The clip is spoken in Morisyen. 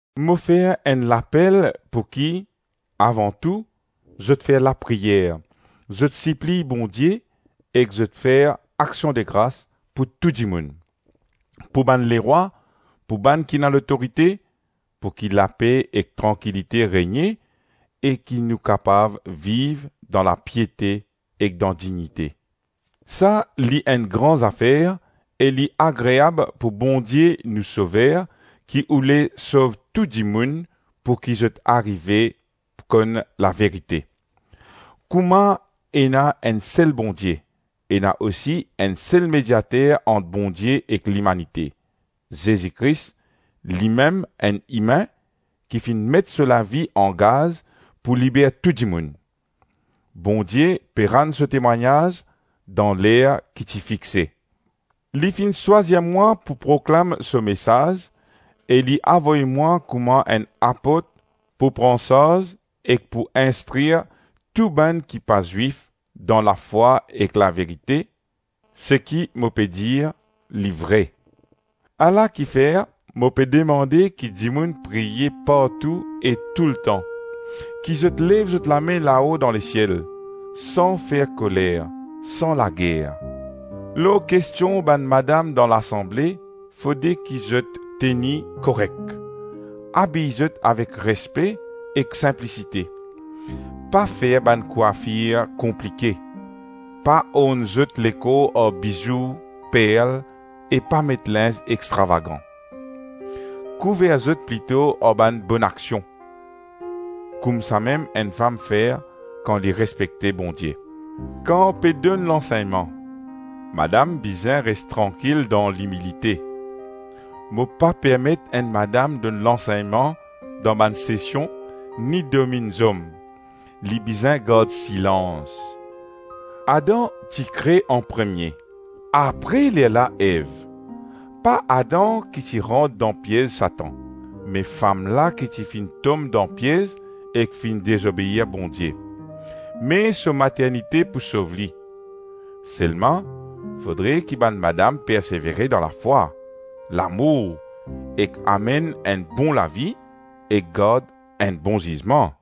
Mo fer enn lapel pouki, avan tou, zot fer lapriyer, zot sipliy Bondie ek zot fer aksiondegras pou tou dimoun, pou bann lerwa, tou bann ki ena lotorite, pouki lape ek trankilite regne e ki nou kapav viv dan lapiete ek dan dignite. Sa li enn gran zafer e li agreab pou Bondie nou Sover ki oule sov tou dimoun pouki zot arive konn laverite. Kouma ena enn sel Bondie, ena osi enn sel mediater ant Bondie ek limanite, Zezi Kris limem enn imin ki finn met so lavi angaz pou liber tou dimoun. Bondie pe rann so temwagnaz dan ler ki ti fixe. Li finn swazir mwa pou proklam so mesaz e li avoy mwa kouma enn apot pou pran sarz ek pou instrir tou bann ki pa Zwif dan lafwa ek laverite; seki mo pe dir li vre. Ala kifer, mo pe demande ki dimoun priye partou e touletan, ki zot lev zot lame lao dan lesiel, san fer koler, san lager. Lor kestion bann madam dan lasanble, fode ki zot teni korek, abiy zot avek respe ek sinplisite; pa fer bann kwafir konplike, pa orn zot lekor ar bizou, perl, e pa met linz extravagan. Kouver zot plito ar bann bonaksion; koumsamem enn fam fer kan li respekte Bondie. Kan pe donn lansegnman, madam bizin res trankil dan limilite. Mo pa permet enn madam donn lansegnman dan bann sesion, ni dominn zom. Li bizin gard silans. Adam ti kre anpremie, apre lerla Ev. Pa Adam ki ti rant dan piez Satan, me fam la ki ti finn tom dan piez ek finn dezobeir Bondie, me so maternite pou sov li. Selma fodre ki bann madam persevere dan lafwa, lamour ek amenn enn bon lavi ek gard enn bon zizman.